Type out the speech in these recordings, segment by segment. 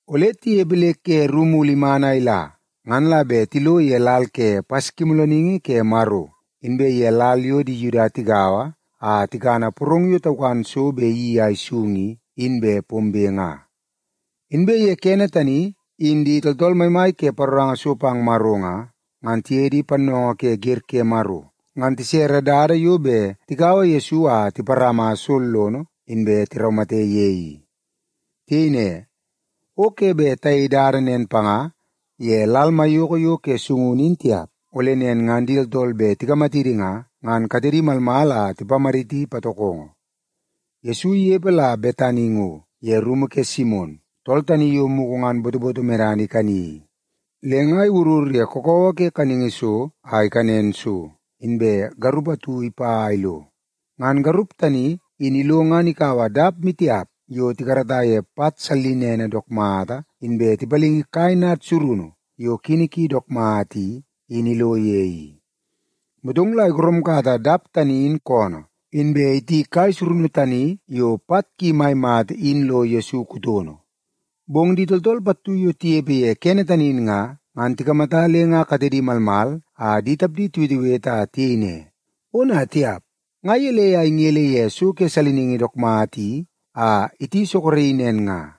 Ole tinepe le ke ru mulu iman a ila ngan la bet tilo ye lal ke Paskimoolooningi ke Maro, inbe ye lal yo di Yuda tigaua a tikana porong yo taukan so bet iyeii a isung i, in bet pombe nga. Inbe ye kene tani, in di tooltool maimai ke paroranga so pang Maro nga, ngan tiye di pannoongoo ke wer ke Maro ngan tisere dada yo bet tikaua Yesu a tiparama sollono, inbe tiraumate ye i. Tiyei ne, “O ke bet tayei dada nen panga ye lal maiyoko yo ke sungunu in tiap, ole nen ngan di tooltool bet tikamatidi nga, ngan katedi malmal a tipamaditi patokongo.” Yesu inepe la Betani ngo ye rumu ke Simon, tool tani yo mugu ngan botoboto medana ikani i. Le nga iwurur ye kakawa ke kaningi so a ikanen so, inbe garup atu ipa a ilo. Ngan garup tani in ilo ngan ikaua dap maitiap yo tikarata ye pat sallinene dook mata, inbe tipalingi kai nad surunu yo kini ki dook mata i, in ilo ye i. Motong la igoromkata dap tani in koonoo, inbe iti kai surunu tani yo pat ki mai mata in lo Yesu kutono. Bong di tooltool pattu yo tinepe ye kene tani in nga, ngan tikamata le nga katedi malmal a di tapdi tiwetewete a tiyei ne, “Ona tiap, nga gelei a ingele ye so ke saliningi dook mata i a iti soroki nen nga?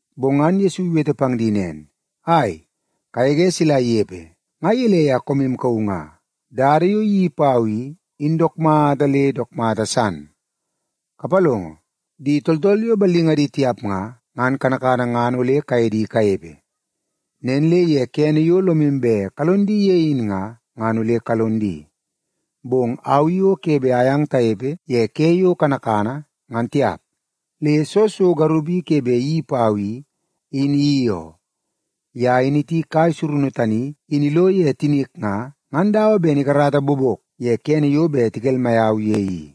Bong ngan Yesu iwete pang di nen “Ai, kagege sila inepe! Nga gelei a koomu kauu nga? Dada yo iyeii pau i, in dook mata le dook mata san. Kapalongo, di tooltool yo ballingadi tiap nga, ngan kanakana ngan ole kaye di kanepe. Nen le ye kene yo lomu bet kalon di ye in nga, ngan ole kalon di. Bong au i o ke bet ayang tanepe ye ke yo kanakana, ngan tiap. Le soo so garup i ke bet iyeii pau i, in iyeii oo. Ye in iti kai surunu tani in ilo ye tinik nga, ngan dawa ben ikarata bobok ye kene yo bet tikelmai au ye i.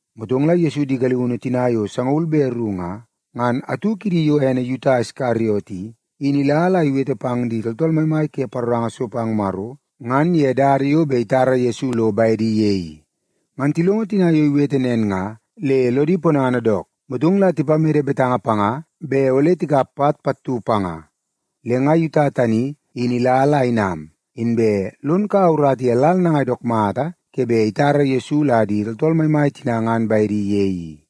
Motong la Yesu di galiunu tina yo sangaul be ru nga, ngan atu kidi yo ene Yuta Iskariot i, in ila la iwete pang di tooltool maimai ke paroranga so pang Maro ngan ye dada yo bet itara Yesu lo bedi ye i. Ngan tilongo tina yo iwete nen nga le lodi ponana dook, motong la tipamede betanga panga bet ole tikap pat pattu panga. Le nga Yuta tani in ila la inam, inbe lon kaua urata ye lal nangai dook mata ke bet itara Yesu la di tooltool maimai tina ngan bedi ye i.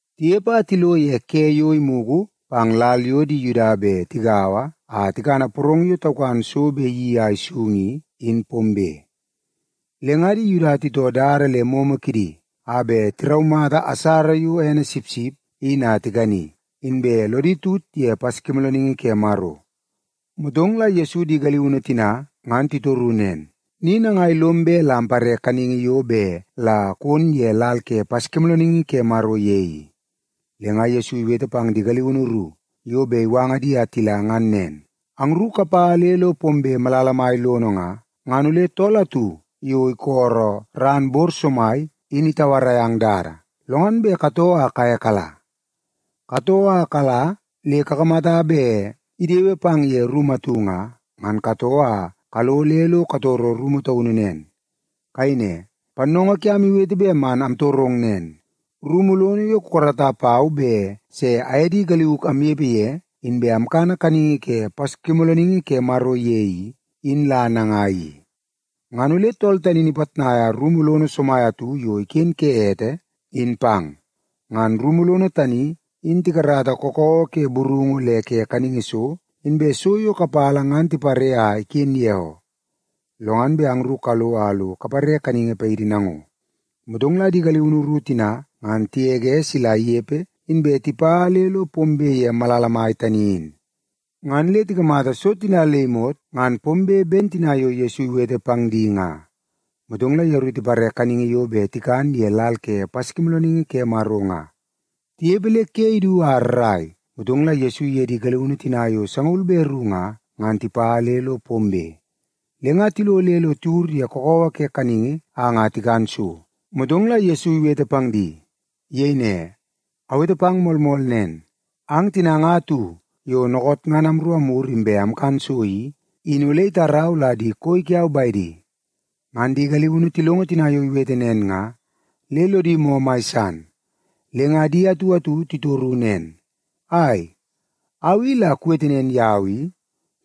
Tinepe a tilo ye ke yo imugu pang lal yo di Yuda bet tigaua a tikana porong yo taukan so yo bet iyeii a isung i, in pombe. Le nga di Yuda titoo dada le momo kidi a bet tiraumata asara yo ene sipsip in a tikani, inbe lodi tut ye Paskimoolooningi ke Maro. Motong la Yesu di galiunu tina ngan titoru nen, “Ni nangai lom bet la ampare kaningi yo bet la kon ye lal ke Paskimoolooningi ke Maro ye i?” Le nga Yesu iwete pang di galiunu ru yo bet iwanga di a tila ngan nen, “Angru kapa le lo pombe malala mai lono nga, ngan ole tool atu yo isolo ran bor somai in itauarai ang dada, lo ngan bet katoo a kaye kala. Katoo a kala le kakamata bet idewe pang ye rumu atu nga, ngan katoo a kalo le lo katoro rumu taunu nen. Kayei ne, ‘Pannoongoo kiam iwete bet man amtorong nen: Rumu lono yo kukarata pau bet se aye di galiuk amnepe ye inbe amkana kaningi ke Paskimoolooningi ke Maro ye i, in la nangai i?’ Ngan ole tool tani in ipitnaia rumu lono somai atu yo iken ke ete, in pang. Ngan rumu lono tani in tikarata kakawa ke burungu le ke kaningi so, inbe so yo kapala ngan tipare a iken ye oo. Lo ngan bet angru kalo a lo kapare kaningi paidi nango.” Motong la di galiunu ru tina ngan tigege sila inepe, inbe tipa le lo pombe ye malala mai tani in. Ngan le tikamata so tina le imot ngan pombe ben tina yo Yesu iwete pang di nga. Motong la yeru tipare kaningi yo bet tikan ye lal ke Paskimoolooningi ke Maro nga. Tinepe le ke idu a rrai, motong la Yesu iye di galiunu tina yo sangaul be ru nga, ngan tipa le lo pombe. Le nga tilo le lo tiwur ye kakawa ke kaningi a nga tikan so, motong la Yesu iwete pang di. Iyei ne, “Awete pang moolmool nen, ang tina nga atu yo dookoot ngan amru amwur inbe amkan so i, in ole itarau la di koi kiau bedi.” Ngan di galiunu tilongo tina yo iwete nen nga, le lodi moo mai san. Le nga di atu atu titoru nen, “Ai, au i la kuwete nen yau i,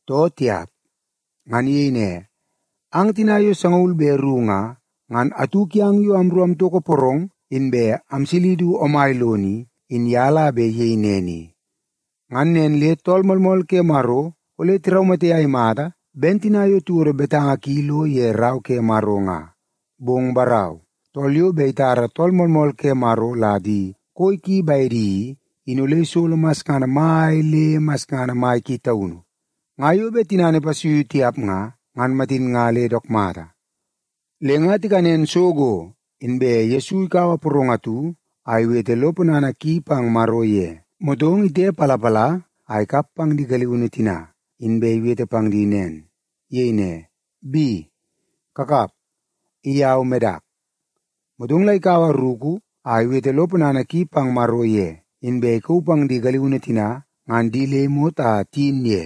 too tiap?” Ngan iyei ne, “Ang tina yo sangaul be ru nga, ngan atu kiang yo amru amtoko porong inbe amsili du omai lono i, in ye la bet iyei nen i. Ngan nen le Tool Moolmool ke Maro ole tiraumate a imata ben tina yo tiwodo betanga ki lo ye Rau ke Maro nga. Bong barau, tool yo bet itara Tool Moolmool ke Maro la di koi ki bedi i, in ole isolo masngana mai le masngana mai ki taunu. Nga yo bet tinana ipasuiu tiap nga, ngan matin nga le dook mata.” Le nga tikanen so go, inbe Yesu ikaua porong atu a iwete lo ponana ki pang Maro ye, motong itepalapala a ikap pang di galiunu tina, inbe iwete pang di nen. Iyei ne, “Bi, kakap. I au medak.” Motong la ikaua ruku a iwete lo ponana ki pang Maro ye, inbe ikauu pang di galiunu tina ngan di le imot a tiyin ye.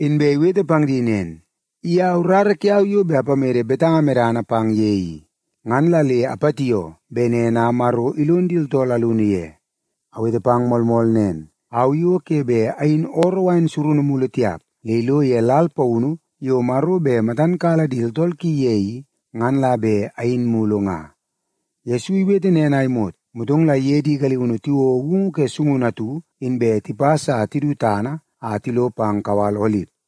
Inbe iwete pang di nen, “I au rara kiau yo bet apamede betanga medana pang ye i. Ngan la le apatioo bet nen a Maro ilon di tooltool alunu ye. Awete pang moolmool nen, au i o ke bet ayin ooroo wain surunu mulu tiap, le ilo ye lal paunu yo Maro bet matan kala di tooltool ki ye i, ngan la bet ayin mulu nga.” Yesu iwete nen a imot, motong la iye di galiunu tiwouo woungu ke sungunu atu, inbe tipas a tidu tana a tilo pang kawal Olip.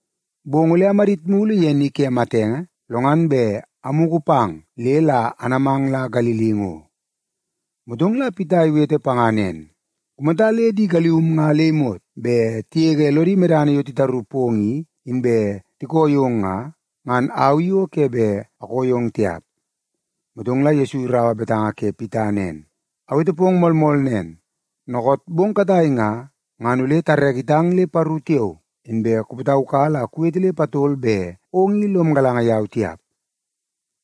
Bong ole amadit mulu ye ni ke matenge, lo ngan bet amugu pang le la anamang la Galili ngo.” Motong la Pita iwete panga nen, “Kumata le di galium nga le imot bet tigege lodi medana yo titaru pong i, inbe tikoo yong nga, ngan au i o ke bet akoo yong tiap.” Motong la Yesu iraua betanga ke Pita nen, “Awete pong moolmool nen, dookoot bong katai nga, ngan ole tareke itang le paru tiao, inbe kupataukala a kuwete le patol bet ong i lom galanga yau tiap.”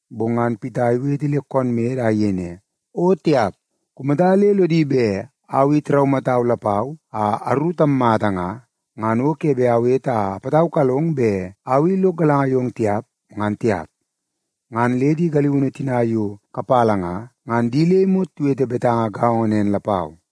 Bong ngan Pita iwete le koon mede a iyei ne, “O tiap! Kumata le lodi bet au i tiraumatau lapau a aru tammata nga, ngan o ke bet awete a apataukalong bet au i lok galanga yong tiap, ngan tiap.” Ngan le di galiunu tina yo kapala nga, ngan di le imot tiwete betanga gaongo nen lapau.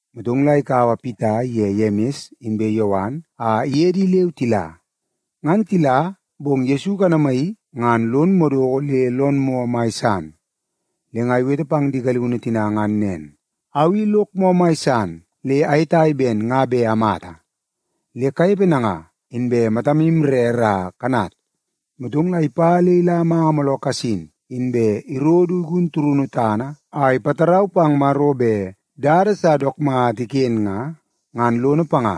Motong la ikaua Pita iye Yemis inbe Yowan a iye di leu tila. Ngan tila, bong Yesu ikanamaii, ngan lon madoko le lon moo mai san. Le nga iwete pang di galiunu tina ngan nen, “Au i lok moo mai san le ayetai ben nga bet amata. Le kanepe nanga, inbe matamu rere a kanat.” Motong la ipa le ila manga mooloo kasin, inbe iro du igun turunu tana a ipatarau pang Maro bet dada sa dook mata iken nga, ngan lono panga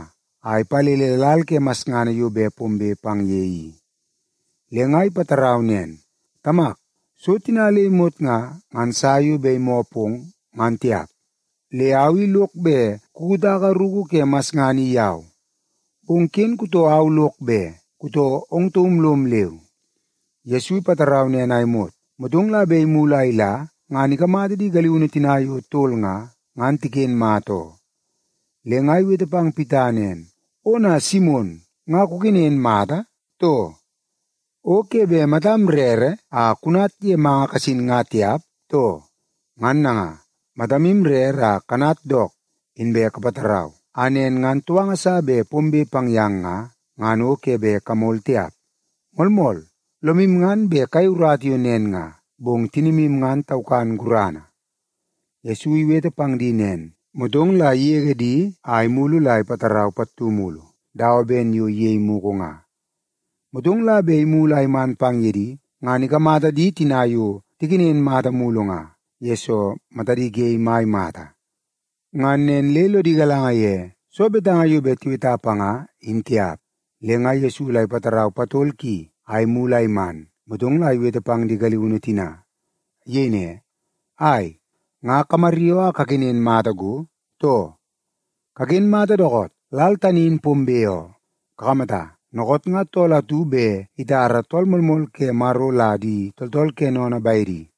a ipalele lal ke masngana yo bet pombe pang ye i. Le nga ipatarau nen, “Tamak, so tina le imot nga, ngan sa yo bet imoo pong, ngan tiap. Le au i lok bet kukutaka ruku ke masngana i yau. Bong ken kutoo au lok be, kutoo ong taum lom leu.” Yesu ipatarau nen a imot, motong la bet imulu a ila, ngan ikamata di galiunu tina yo tol nga, ngan tiken mata oo. Le nga iwete pang Pita nen, “Ona Simon, nga kukenen mata, too? O ke bet matam rere a kunat ye manga kasin nga tiap, too? Ngan nanga, matamu rere a kanat dook inbe kapatarau, a nen ngan touanga sa bet pombe pang yang nga, ngan o ke bet kamol tiap. Moolmool, lomu ngan bet kayei urata yo nen nga, bong tinimu ngan taukan gurana.” Yesu iwete pang di nen, motong la igege di a imulu la ipatarau pattu mulu dawa ben yo iyei mugu nga. Motong la bet imulu a iman pang ye di, ngan ikamata di tina yo tikenen mata mulu nga, yesoo matadi ge mai mata. Ngan nen le lodi galanga ye soo betanga yo bet tiweta panga, in tiap. Le nga Yesu la ipatarau patol ki a imulu a iman, motong la iwete pang di galiunu tina. Iyei ne, “Ai, nga kamaryoo a kakenen mata go, too? Kaken mata dookoot! Lal tani in pombe oo. Kakamata, dookoot nga tool atu bet itara Tool Moolmool ke Maro la di tooltool ke sennene bedi.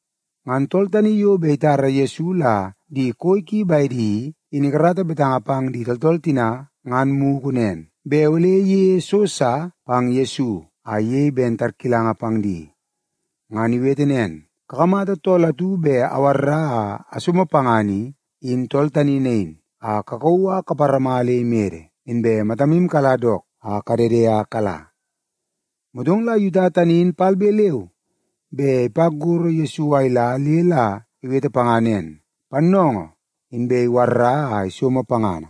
Ngan tool tani yo bet itara Yesu la di koi ki bedi i, in ikarata betanga pang di tooltool tina ngan mugu nen, bet ole iyeie so sa pang Yesu a iyei ben tarkilanga pang di. Ngan iwete nen, “Kakamata tool atu bet awarra a asomo pangana i, in tool tani nain, a kakauu a kaparama le imede, inbe matamu kala dook a kadede a kala.” Motong la Yuta tani in palbe leu be ipa gorro Yesu a ila le la iwete panga nen, “Pannoongoo!” Inbe iwarra a isomo pangana.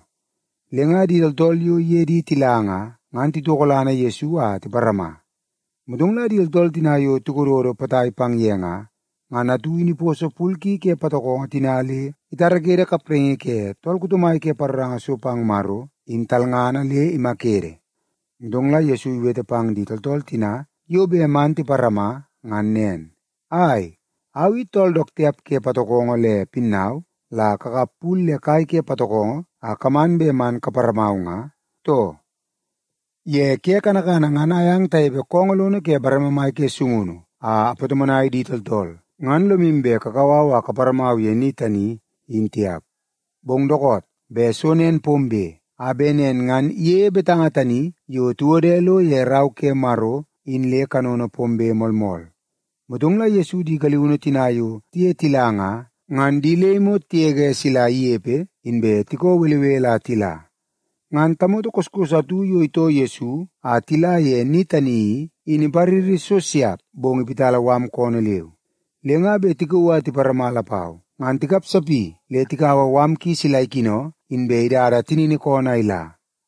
Le nga di tooltool yo iye di tila nga, ngan titokolana Yesu a tiparama. Motong la di tooltool tina yo tikododo potai pang ye nga, ngan atu in iposo pul ki ke patokongo tina le itarakede kapraingi ke tool kuto mai ke paroranga so pang Maro, in talngana, le imakede. Motong la Yesu iwete pang di tooltool tina yo bet man tiparama ngan nen, “Ai, au i tool dook tiap ke patokongo le pinnau la kakap pul le kai ke patokongo a kaman bet man kaparamau nga, too? Ye ke kanakana ngan ayang tanepe koongoo lono ke bareme mai ke sungunu a apatomonai di tooltool, ngan lomu bet kakau au a kaparamau ye ni tani in tiap. Bong dookoot bet so nen pombe, a bet nen ngan iyeie betanga tani yo tiwode lo ye Rau ke Maro in le kanono pombe moolmool.” Motong la Yesu di galiunu tina yo tiye tila nga, ngan di le imot tigege sila inepe, inbe tikoo belebele a tila. Ngan tamoto koskos atu yo itoo Yesu a tila ye ni tani i, in ipariri so siap bong iwiti mala koonoo leu. Le nga bet tikauu a tiparama lapau, ngan tikapsapi le tikaua mala ki sila ikino, inbe idada tinini koonoo a ila.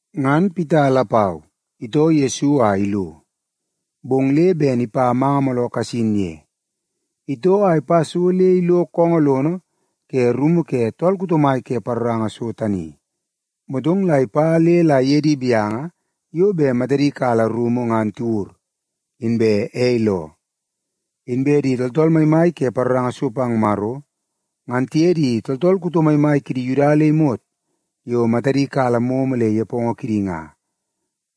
Ngan Pita lapau itoo Yesu a ilo, bong le ben ipa manga mooloo kasin ye. Itoo a ipa so le ilo koongoo lono ke rumu ke tool kuto mai ke paroranga so tani, motong la ipa le la iye di gaunu yo bet matadi kala rumu ngan tiwur, inbe ei loo. Inbe di tooltool maimai ke paroranga so pang Maro, ngan tiye di tooltool kuto maimai kidi Yuda le imot yo matadi kala momo le nepongo kidi nga,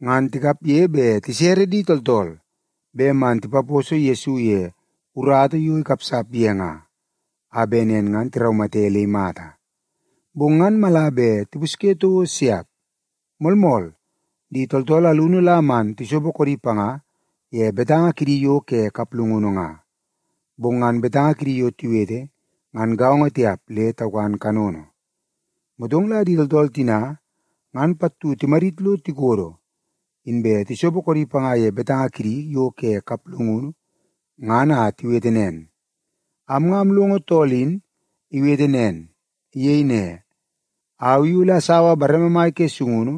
ngan tikapge bet tisere di tooltool bet man tipaposo Yesu ye urata yo ikapsap ye nga, a bet nen ngan tiraumate le imata. Bong ngan mala bet tipusye toko siap. Moolmool, di tooltool alunu la man tisopo koodi panga ye betanga kidi yo ke kaplungunu nga, bong ngan betanga kidi yo tiwete ngan gaongo tiap le taukan kanono. Motong la di tooltool tina ngan pattu timadit lo tikodo, inbe tisopo koodi panga ye betanga kidi yo ke kaplungunu ngan a tiwete nen, “Am nga amlongo tool in iwete nen. Iyei ne, ‘Au i ole asaua bareme mai ke sungunu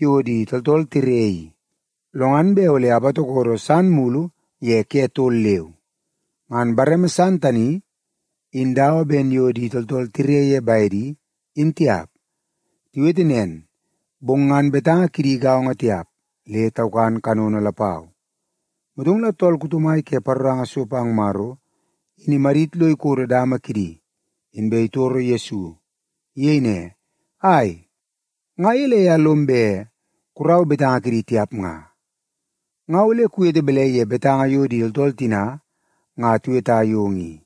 yo di tooltool tire i, lo ngan bet ole apatokodo san mulu ye ke tol leu. Ngan bareme san tani, in dawa ben yo di tooltool tire ye bedi, in tiap.’” Tiwete nen, bong ngan betanga kidi gaongo tiap, le taukan kanono lapau. Motong la tool kuto mai ke paroranga so pang Maro in imadit lo ikodo dama kidi, inbe itoro Yesu. Iyei ne, “Ai, nga gelei a lom bet kurau betanga kidi tiap nga? Nga ole kuwete balai ye betanga yo di tooltool tina nga tiweta yong i?”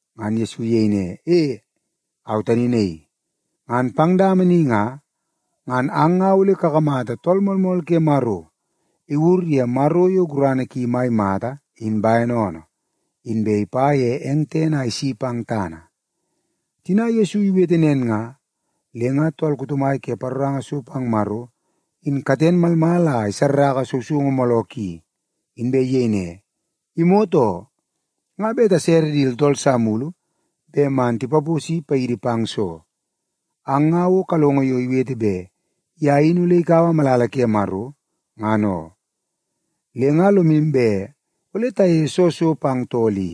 Ngan Yesu iyei ne, “E, au tani naii. Ngan pang dama ni nga, ngan ang nga ole kakamata Tool Moolmool ke Maro iwur ye Maro yo gurana ki mai mata in bene oonoo, inbe ipa ye eng tene a isi pang tana.” Tina Yesu iwete nen nga, le nga tool kuto mai ke paroranga so pang Maro in katen malmal a isarraka sousoungu mooloo ki, inbe iyei ne, “Imot oo! Nga bet tasere di tooltool sa mulu bet man tipaposi paidi pang soo? Ang nga o kalongo yo iwete bet ye in ole ikaua malala ke Maro, ngan oo. Le nga lomu bet ole tayeie soo so pang tool i?”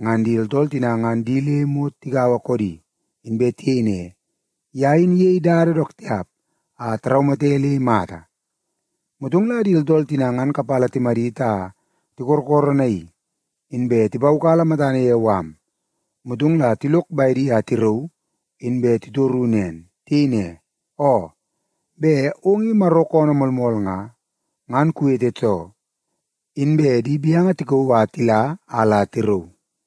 Ngan di tooltool tina ngan di le imot tigaua koodi, inbe tiyei ne, “Ye in iyei dada dook tiap a taraumate le imata.” Motong la di tooltool tina ngan kapala timadit a tikorokoronaii, inbe tipaukala matana ye mala, motong la tilok bedi a tirauu, inbe titoru nen. Tiyei ne, “Oo, bet ong i Maro koonoo moolmool nga, ngan kuwete too.” Inbe di gaunu tikauu a tila a la tirauu.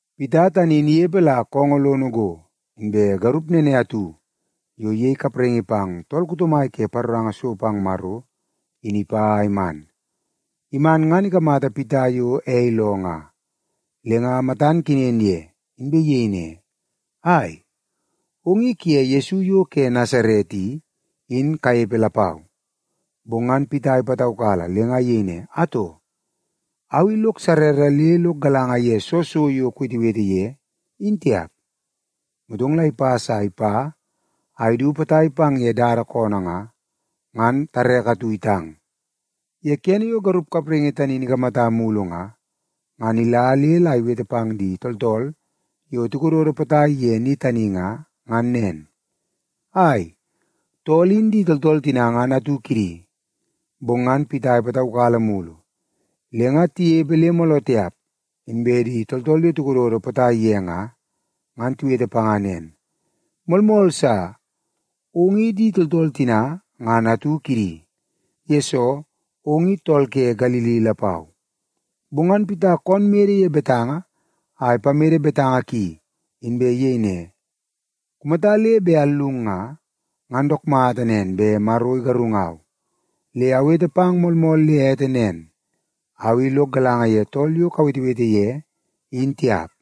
Pita tani in inepe la koongoo lono ngo, inbe garup nene atu yo iyei kapraingi pang tool kuto mai ke paroranga so pang Maro, in ipa a iman. Iman ngan ikamata Pita yo ei loo nga, le nga matan kenen ye, inbe iyei ne, “Ai, ong i kuye Yesu yo ke Nasaret i, in kanepe lapau.” Bong ngan Pita ipataukala le nga iyei ne, “Atoo, au i nga lok sarara le lok galanga ye soo so yo kuwetewete ye, in tiap.” Motong la ipas a ipa a idu potai pang ye dada koonoo nga, ngan tareke atu itang. Ye kene yo garup kapraingi tani in ikamata mulu nga, ngan ila le la iwete pang di tooltool yo tikododo potai ye ni tani nga, ngan nen, “Ai, tool in di tooltool tina ngan atu kidi.” Bong ngan Pita ipataukala mulu. Le nga tinepe le mooloo tiap, inbe di tooltool yo tikododo potai ye nga, ngan tiwete panga nen, “Moolmool sa, ong i di tooltool tina ngan atu kidi, yesoo ong i tool ke Galili lapau.” Bong ngan Pita koonoo mede ye betanga a ipamede betanga ki, inbe iyei ne, “Kumata le bet allung nga, ngan dook mata nen bet Maro igarungau. Le awete pang moolmool le ete nen, au i lok galanga ye tool yo kawetewete ye, in tiap.”